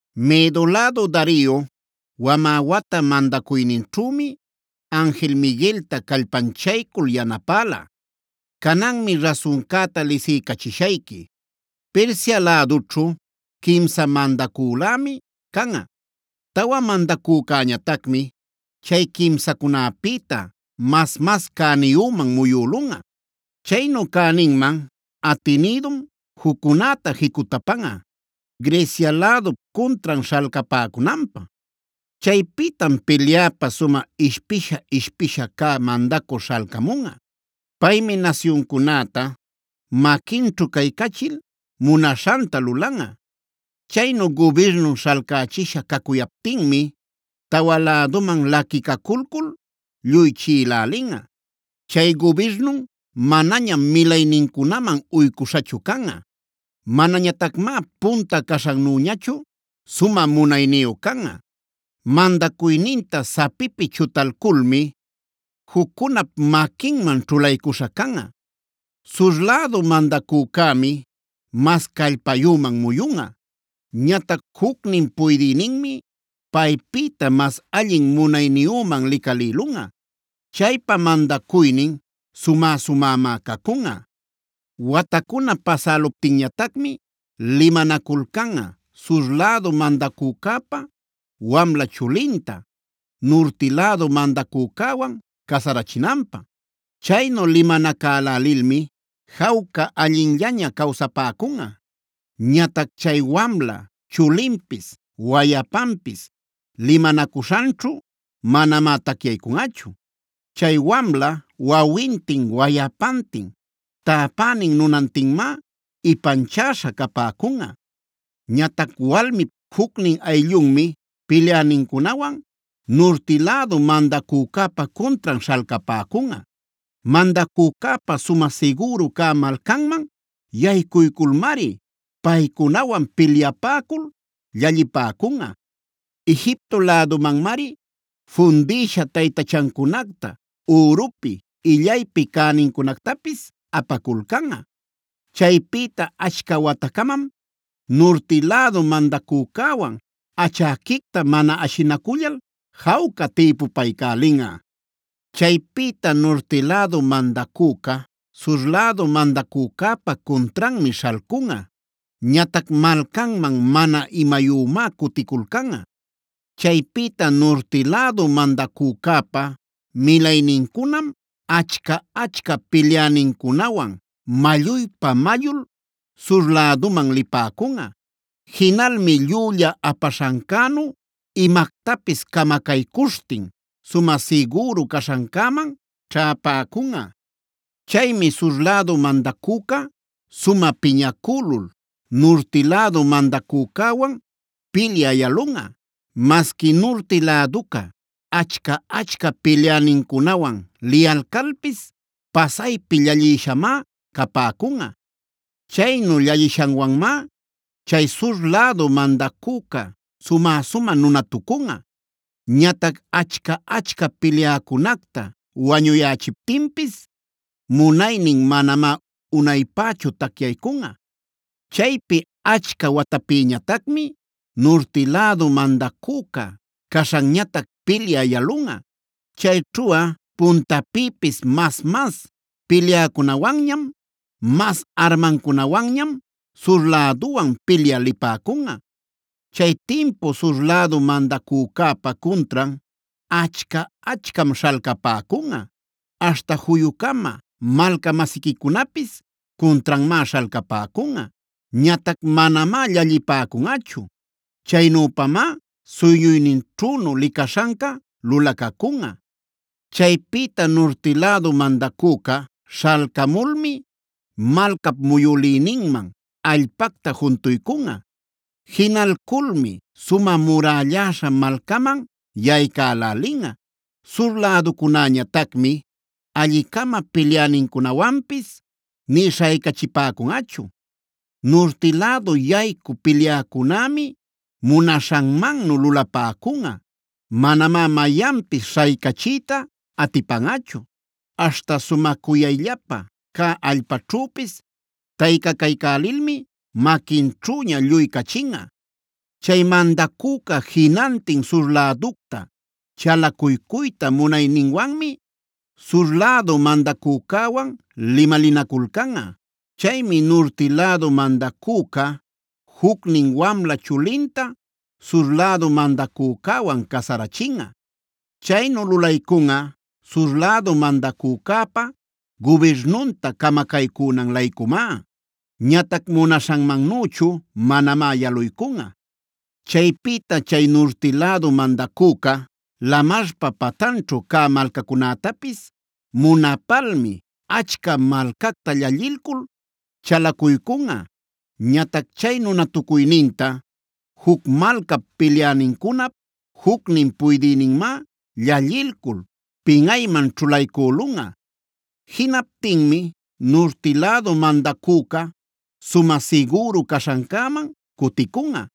“Medo lädu Dario, wamä wata mandacuyninćhümi anjil Migueltaa callpanchaycul yanapälá. “Cananmi rasuncäta lisiycachishayqui. Persia lädućhu quimsa mandacülämi canꞌa. Tawa mandacücäñatacmi chay quimsacunäpïta mas-mas cäniyüman muyülunꞌa. Chaynu cäninman atinïdum juccunäta jicutapanꞌa, Grecia lädup cuntran śhalcapäcunanpä. “Chaypïtam pilyapä sumä ishpisha-ishpisha cä mandacü śhalcamunꞌa. Paymi nasyuncunäta maquinćhu caycachil munaśhanta lulanꞌa. Chaynu gubirnun śhalcächisha cacuyaptinmi tawa läduman laquicaculcul lluy chiꞌilälinꞌa. Chay gubirnun manañam milaynincunaman uycuśhachu canꞌa. Manañatacmá punta caśhannüñachu sumä munayniyu canꞌa. Mandacuyninta sapipi chutalculmi juccunap maquinman ćhulaycuśha canꞌa. “Sur lädu mandacücämi mas callpayüman muyunꞌa. Ñatac jucnin puydïninmi paypïta mas allin munayniyüman licalïlunꞌa. Chaypa mandacuynin sumä-sumämá cacunꞌa. “Watacuna pasäluptinñatacmi limanaculcanꞌa, sur lädu mandacücäpab wamla chulinta, nurti lädu mandacücäwanc casarachinanpä. Chaynu limanacälälilmi jawca allinllaña cawsapäcunꞌa. Ñatac chay wamla chulinpis wayapanpis limanacuśhanćhu manamá tacyaycunꞌachu. Chay wamla, wawintin, wayapantin, täpänin nunantinmá ipanchäśha capäcunꞌa. Ñatac walmip jucnin ayllunmi pilyänincunawan nurti lädu mandacücäpa cuntran śhalcapäcunꞌa. Mandacücäpa sumä sigüru cä malcanman yaycuyculmari paycunawan pilyapäcul llallipäcunꞌa. Egipto lädumanmari fundïsha taytachancunacta, ürupi illaypi cänincunactapis apaculcanꞌa. Chaypïta achca watacamam nurti lädu mandacücäwan achäquicta mana ashinacullal jawca tïpupaycälinꞌa. “Chaypïta nurti lädu mandacüca sur lädu mandacücäpa cuntranmi śhalcunꞌa. Ñatac malcanman mana imayümá cuticulcanꞌa. Chaypïta nurti lädu mandacücäpa milaynincunam achca-achca pilyänincunawan malluypa-mallul sur läduman lipäcunꞌa. Jinalmi llülla apaśhancänu imactapis camacaycuśhtin sumä sigüru caśhancäman ćhäpäcunꞌa. “Chaymi sur lädu mandacüca sumä piñacülul, nurti lädu mandacücäwan pilyä yalunꞌa. Masqui nurti läduca achca-achca pilyänincunawan liyalcalpis pasaypi llallïshamá capäcunꞌa. Chaynu llallishanwanmá chay sur lädu mandacüca sumä-sumä nunatucunꞌa. Ñatac achca-achca pilyäcunacta wañuyächiptinpis munaynin manamá unaypächu tacyaycunꞌa. “Chaypi achca watapïñatacmi nurti lädu mandacüca caśhanñatac pilyä yalunꞌa. Chayćhuꞌa puntapïpis mas-mas pilyäcunawanñam, mas armancunawanñam sur läduwan pilyä lipäcunꞌa. “Chay timpu sur lädu mandacücäpa cuntran achca-achcam śhalcapäcunꞌa, aśhta juyu-cama malca-masiquicunapis cuntranmá śhalcapäcunꞌa. Ñatac manamá llallipäcunꞌachu. Chaynüpamá suyñuyninćhünu licaśhanca lulacacunꞌa. “Chaypïta nurti lädu mandacüca śhalcamulmi malcap muyülïninman allpacta juntuycunꞌa. Jinalculmi sumä murälläśha malcaman yaycälälinꞌa. Sur läducunäñatacmi alli-cama pilyänincunawanpis nï śhaycachipäcunꞌachu. Nurti lädu yaycü pilyäcunämi munaśhanmannu lulapäcunꞌa. Manamá mayanpis śhaycachiyta atipanꞌachu. Aśhta sumä cuyayllapa cäd allpaćhüpis taycacaycälilmi maquinćhüña lluy cachinꞌa. Chay mandacüca jinantin sur läducta, chalacuycuyta munayninwanmi sur lädu mandacücäwan limalinaculcanꞌa. Chaymi nurti lädu mandacüca jucnin wamla chulinta sur lädu mandacücäwan casarachinꞌa. Chaynu lulaycunꞌa sur lädu mandacücäpa gubirnunta camacaycünan-laycumá. Ñatac munaśhanmannüchu manamá yaluycunꞌa. “Chaypïta chay nurti lädu mandacüca lamarpa pantanćhu cä malcacunätapis munapalmi achca malcacta llallilcul chalacuycunꞌa. Ñatac chay nunatucuyninta juc malcap pilyänincunap jucnin puydïninmá llallilcul pinꞌayman ćhulaycülunꞌa. Jinaptinmi nurti lädu mandacüca sumä sigüru caśhancäman cuticunꞌa.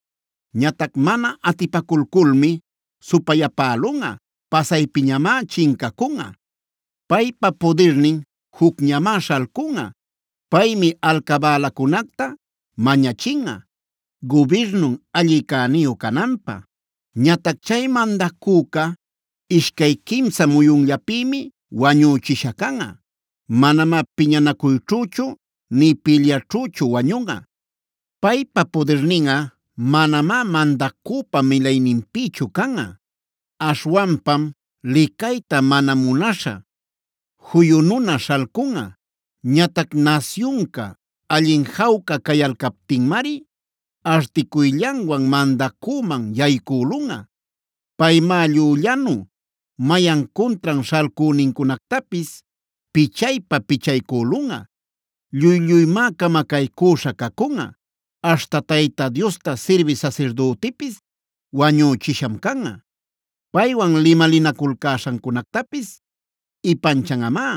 Ñatac mana atipaculculmi supayapälunꞌa; pasaypiñamá chincacunꞌa. “Paypa pudirnin jucñamá śhalcunꞌa. Paymi alcabälacunacta mañachinꞌa gubirnun alli cäniyu cananpä. Ñatac chay mandacüca ishcay quimsa muyunllapïmi wañüchisha canꞌa; manamá piñanacuyćhüchu nï pilyaćhüchu wañunꞌa. “Paypa pudirninꞌa manamá mandacüpa milayninpïchu canꞌa; aśhwanpam licayta mana munaśha, juyu nuna śhalcunꞌa. Ñatac nasyunca allin jawca cayalcaptinmari articuyllanwan mandacüman yaycülunꞌa. Paymá llüllanu mayan cuntran śhalcünincunactapis pichaypa-pichaycülunꞌa; lluy-lluymá camacaycüśha cacunꞌa; aśhta Tayta Diosta sirbï sasirdütipise wañüchisham canꞌa. Paywan limalinaculcäśhancunactapis ipanchanꞌamá.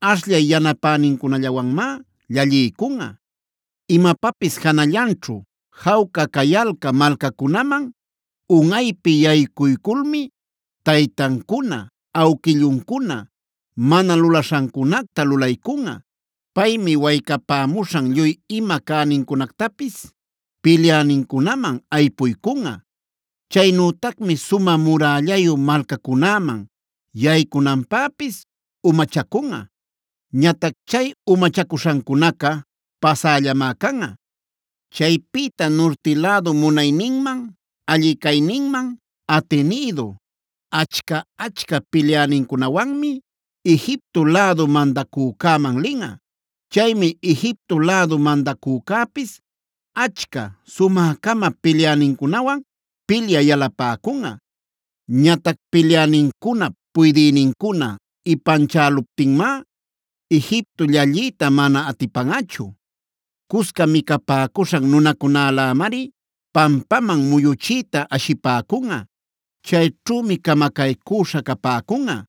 Ashllay yanapänincunallawanmá llalliycunꞌa. Imapapis janallanćhu jawca cayalcä malcacunaman unꞌaypi yaycuyculmi taytancuna, awquilluncuna mana lulaśhancunacta lulaycunꞌa. Paymi waycapämuśhan lluy ima cänincunactapis pilyänincunaman aypuycunꞌa. Chaynütacmi sumä murällayu malcacunäman yaycunanpäpis umachacunꞌa. Ñatac chay umachacuśhancunaca pasällamá canꞌa. “Chaypïta nurti lädu munayninman, alli cayninman atinïdu achca-achca pilyänincunawanmi Egipto lädu mandacücäman linꞌa. Chaymi Egipto lädu mandacücäpis achca, sumä-cama pilyänincunawan pilyä yalapäcunꞌa. Ñatac pilyänincunap puydïnincuna ipanchäluptinmá Egipto llalliyta mana atipanꞌachu. Cusca micapäcuśhan nunacunälämari pampaman muyuchiyta ashipäcunꞌa. Chayćhümi camacaycüśha capäcunꞌa;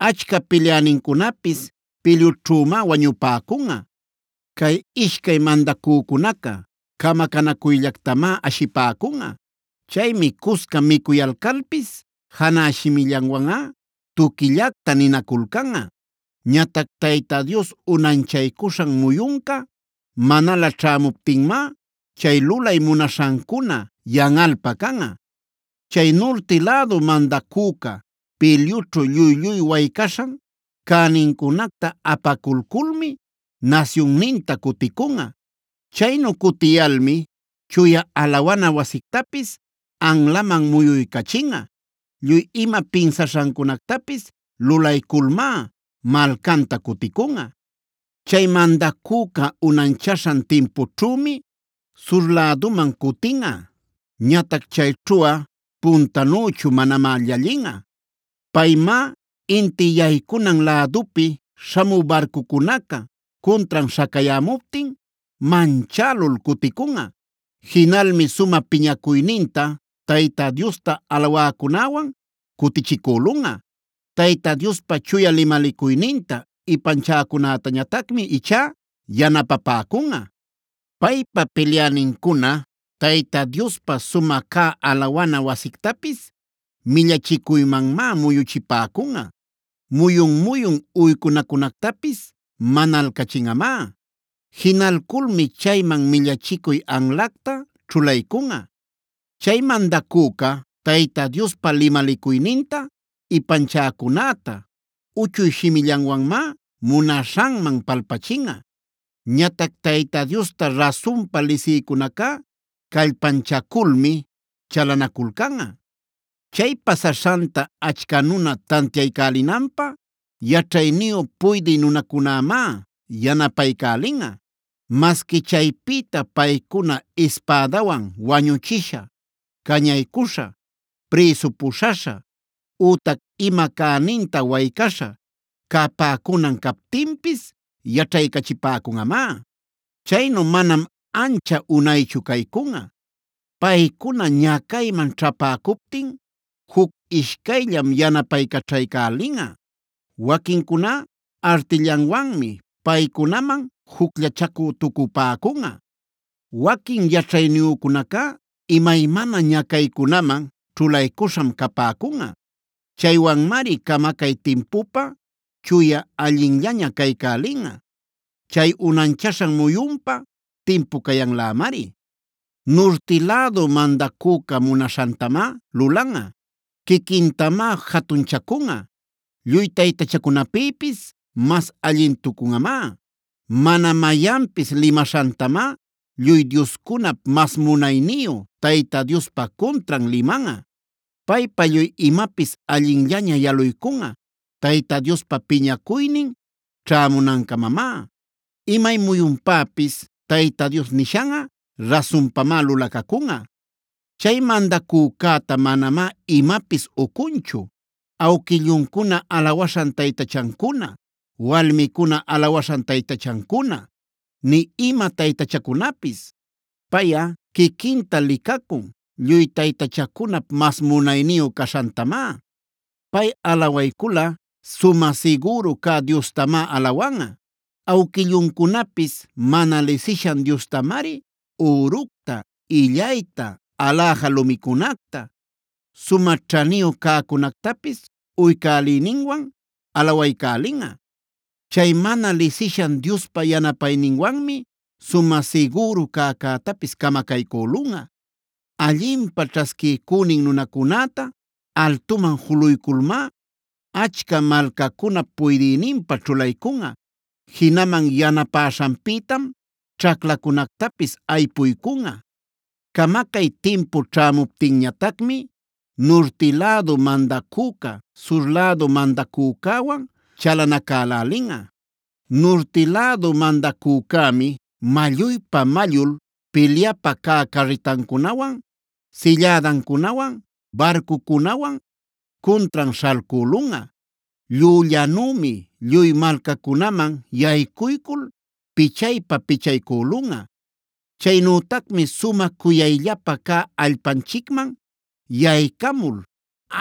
achca pilyänincunapis pilyućhümá wañupäcunꞌa. Cay ishcay mandacücunaca camacanacuyllactamá ashipäcunꞌa. Chaymi cusca micuyalcalpis janä shimillanwanꞌa tuquillacta ninaculcanꞌa. Ñatac Tayta Dios unanchaycuśhan muyunca manalä ćhämuptinmá chay lulay munaśhancuna yanꞌalpa canꞌa. “Chay nurti lädu mandacüca pilyućhu lluy-lluy waycaśhan cänincunacta apaculculmi nasyunninta cuticunꞌa. Chaynu cutiyalmi chuya alawana wasictapisf anlaman muyuycachinꞌa. Lluy ima pinsaśhancunactapis lulayculmá malcanta cuticunꞌa. “Chay mandacüca unanchaśhan timpućhümi sur läduman cutinꞌa. Ñatac chayćhuꞌa puntanüchu manamá llallinꞌa. Paymá inti yaycunan lädupi śhamü barcucunaca cuntran śhacayämuptin manchälul cuticunꞌa. Jinalmi sumä piñacuyninta Tayta Diosta alawäcunäwan cutichicülunꞌa. Tayta Diospa chuya limalicuyninta ipanchäcunätañatacmi ichá yanapapäcunꞌa. “Paypa pilyänincuna Tayta Diospa sumä cä alawana wasictapis millachicuymanmá muyuchipäcunꞌa;g muyun-muyun uycunacunactapis manalcachinꞌamá. Jinalculmi chayman millachicuy anlacta ćhulaycunꞌa. Chay mandacüca Tayta Diospa limalicuyninta ipanchäcunäta uchuy shimillanwanmá munaśhanman palpachinꞌa. Ñatac Tayta Diosta rasunpa lisïcunacá callpanchaculmi chalanaculcanꞌa. Chay pasaśhanta achca nuna tantiaycälinanpä yaćhayniyu puydï nunacunämá yanapaycälinꞌa. Masqui chaypïta paycuna ispädawan wañuchisha, cañaycuśha, prïsu puśhaśha, ütac ima cäninta waycaśha capäcunan captinpis yaćhaycachipäcunꞌamá. Chaynu manam ancha unaychu caycunꞌa. Paycuna ñacayman ćhäpäcuptin juc ishcayllam yanapaycaćhaycälinꞌa. Waquincuná artillanwanmi paycunaman jucllachacü-tucupäcunꞌa. Waquin yaćhayniyücunacá imaymana ñacaycunaman ćhulaycuśham capäcunꞌa. Chaywanmari camacay timpupä chuya, allinllaña caycälinꞌa. Chay unanchaśhan muyunpa timpu cayanlämari. “Nurti lädu mandacüca munaśhantamá lulanꞌa. Quiquintamá jatunchacunꞌa; lluy taytachacunapïpis mas allintucunꞌamá;h mana mayanpis limaśhantamá lluy dioscunap mas munayniyu Tayta Diospa cuntran limanꞌa.i Paypa lluy imapis allinllaña yaluycunꞌa Tayta Diospa piñacuynin ćhämunancamamá. Imay muyunpäpis Tayta Dios nishanꞌa rasunpamá lulacacunꞌa. Chay mandacücäta manamá imapis ucunchu awquilluncuna alawaśhan taytachancuna, walmicuna alawaśhan taytachancuna, nï ima taytachacunapis. Payꞌa quiquinta licacun lluy taytachacunap mas munayniyu caśhantamá. Pay alawayculꞌa, sumä sigüru cä diostamá alawanꞌa. Awquilluncunapis mana lisishan diostamari üructa, illayta, aläja lumicunacta, sumä ćhaniyu cäcunactapis uycäliyninwan alawaycälinꞌa. Chay mana lisishan diospa yanapayninwanmi sumä sigüru cäcätapis camacaycülunꞌa. Allinpä ćhasquiycünin nunacunäta altuman juluyculmá achca malcacunap puydïninpä ćhulaycunꞌa; jinaman yanapäśhanpïtam ćhaclacunactapis aypuycunꞌa. “Camacay timpu ćhämuptinñatacmi nurti lädu madacüca sur lädu mandacücäwan chalanacälälinꞌa. Nurti lädu mandacücämi malluypa-mallul pilyapa cä carritancunawan, sillädancunawan, barcucunawan cuntran śhalcülunꞌa. Llüllanümi lluy malcacunaman yaycuycul pichaypa-pichaycülunꞌa. Chaynütacmi sumä cuyayllapa cä allpanchicman yaycamul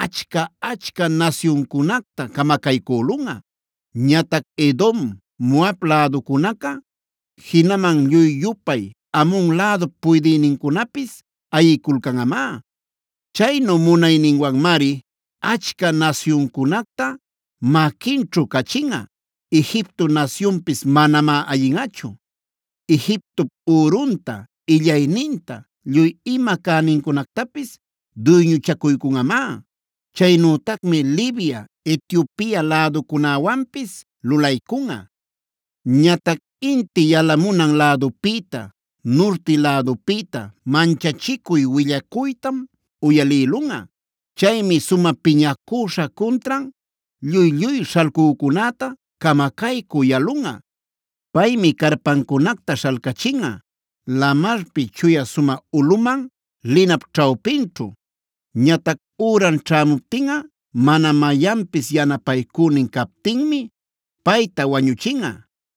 achca-achca nasyuncunacta camacaycülunꞌa. Ñatac Edom, Moab läducunaca, jinaman lluy-yupay Amon lädup puydïnincunapis ayiculcanꞌamá. Chaynu munayninwanmari achca nasyuncunacta maquinćhu cachinꞌa; Egipto nasyunpis manamá ayinꞌachu. Egiptop ürunta, illayninta, lluy ima cänincunactapis duyñuchacuycunꞌamá. Chaynütacmi Libia, Etiopia läducunäwanpis lulaycunꞌa. “Ñatac inti yalamunan lädupïta, nurti lädupïta manchachicuy willacuytam uyalïlunꞌa. Chaymi sumä piñacüśha cuntran lluy-lluy śhalcücunäta camacaycü yalunꞌa. Paymi carpancunacta śhalcachinꞌa lamarpi Chuya sumä ulꞌuman linap ćhawpinćhu. Ñatac üran ćhämuptinꞌa mana mayanpis yanapaycünin captinmi payta wañuchinꞌa.